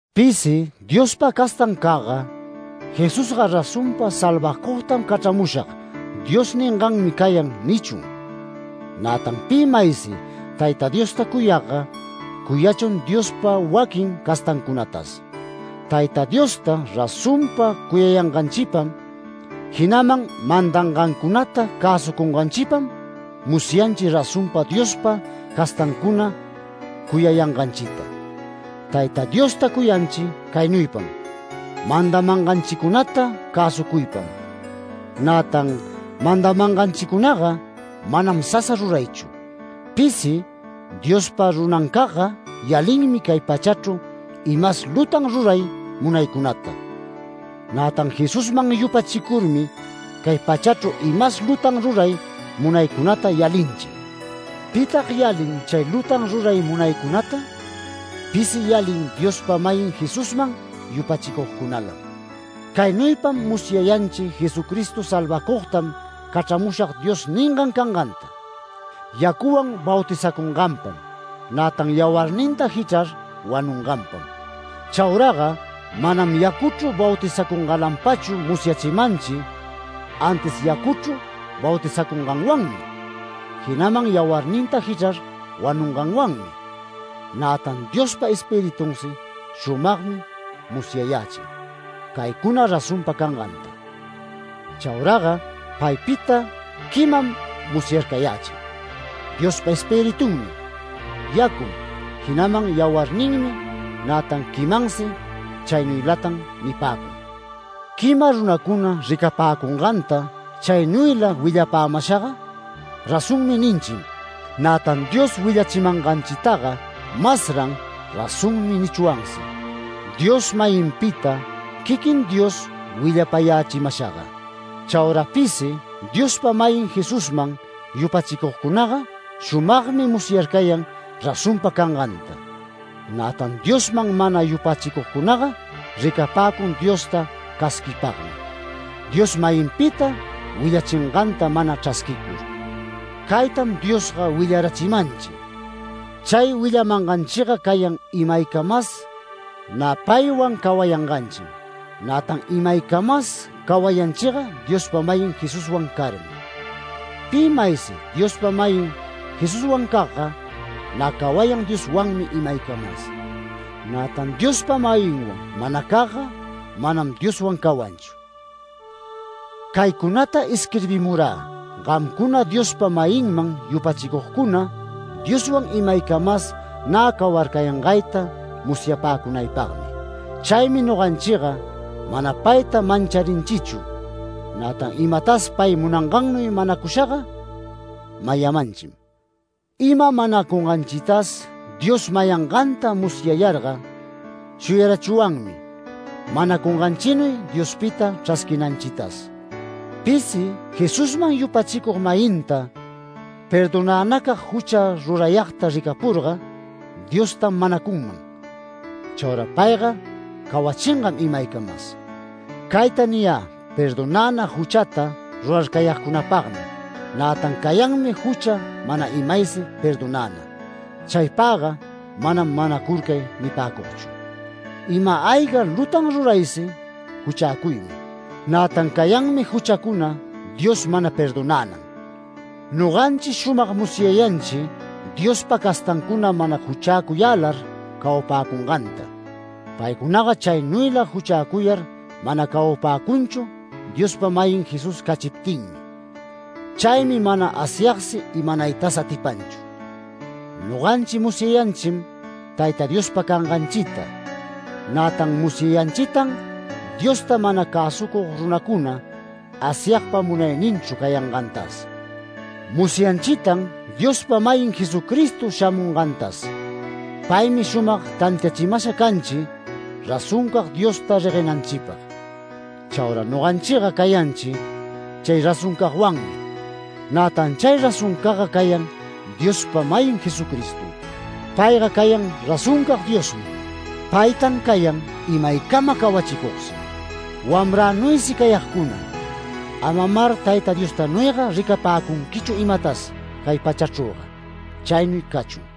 Pisi Diospa castancagga “Jesusga razonpa ‘Salvacugtam cachramushag’ Dios ninganmi cayan” nichun. Nätan pi maysi Tayta Diosta cuyagga, cuyachun Diospa waquin castancunatas. Tayta Diosta razonpa cuyanganchipam, jinaman mandangancunata cäsucunganchipam, musyanchi razonpa Diospa castancuna cuyayanganchita. Tayta Diosta cuyanchi caynuypam: mandamanganchicunata cäsucuypam. Nätan mandamanganchicunaga manam sasa ruraychu. Pisi Diospa runancagga, yalinmi cay pachachru imas lutan ruray munaycunata. Nätan Jesusman yupachicurmi cay pachachru imas lutan ruray munaycunata yalinchi. ¿Pitag yalin chay lutan ruray munaycunata? Pisi yalin Diospa-mayin Jesusman yupachicugcunalam. Caynuypam musyayanchi Jesucristo ‘Salvacugtam cachramushag’ Dios ningan canganta: Yacuwan bautizacunganpam, nätan yawarninta jichrar wanunganpam. Chauraga manam yacuchru bautizacungalanpachu musyachimanchi, antis yacuchru bautizacunganwanmi, jinaman yawarninta jichrar wanunganwanmi. Nätan Diospa Espiritunsi shumagmi musyayächin caycuna razonpa cangantaga. Chauraga paypita quimam musyarcayächin. Diospa Espiritunmi, yacum, jinaman yawarninmi, nätan quimansi chaynuylatam nipäcun. Quima runacuna ricapäcunganta chaynuyla willapämashaga “Razonmi” ninchim, nätan Dios willachimanganchitaga masran “Razonmi” nichwansi, Dios-mayinpita quiquin Dios willapayächimashaga. Chaura pisi Diospa-mayin Jesusman yupachicugcunaga shumagmi musyarcayan razonpa canganta. Nätan Diosman mana yupachicugcunaga, ricapäcun Diosta casquipagmi, Dios-mayinpita willachinganta mana chrasquicur. Caytam Diosga willarachimanchi: Chay willamanganchiga cayan imaycamas nä paywan cawayanganchim, nätan imaycamas cawayanchiga Diospa-mayin Jesuswan carmi. Pi maysi Diospa-mayin Jesuswancagga, nä cawayan Dioswanmi imaycamas. Nätan Diospa-mayinwan manacagga manam Dioswan cawanchu. Caycunata isquirbimurä, gamcuna Diospa-mayinman yupachicugcuna, Dioswan imaycamas nä cawarcayangayta musyapäcunaypagmi. Chaymi noganchiga mana payta mancharinchichu. Nätan imatas pay munangannuy manacushaga mayamanchim. Ima manacunganchitas Dios mayanganta musyayarga, shuyarachwanmi manacunganchinuy Diospita chrasquinanchitas. Pisi Jesusman yupachicug-mayinta perdonänacag jucha rurayagta ricapurga, Diostam manacunman. Chaura payga cawachingam imaycamas. Cayta niyä perdonäna juchata rurarcayagcunapagmi, nätan cayanmi jucha mana imaysi perdonäna. Chaypagga manam manacurcay nipäcugchu. Ima-ayga lutan ruraysi juchäcuymi. Nätan cayanmi juchacuna Dios mana perdonänan. Noganchi shumag musyayanchi, Diospa castancuna mana juchäcuyälar cawapäcunganta. Paycunaga chaynuyla juchäcuyar mana cawapäcunchu Diospa-mayin Jesús cachiptinmi. Chaymi mana Asyagsi imanaytas atipanchu. Noganchi musyanchim Tayta Diospa canganchita. Nätan musyanchitan Diosta mana cäsucug runacuna Asyagpa munayninchru cayangantas. Musyanchitan Diospa-mayin Jesucristo shamungantas. Paymi shumag tantiachimasha canchi razoncag Diosta reguenanchipag. Chaura noganchiga cayanchi chay razoncagwanmi. Nätan chay razoncagga cayan Diospa-mayin Jesucristom. Payga cayan razoncag Diosmi. Paytan cayan imaycama cawachicugsi. Wamränuysi cayagcuna, amamar Tayta Diostanuyga ricapäcunquichu imatas cay pachachrüga. Chaynuy cachun.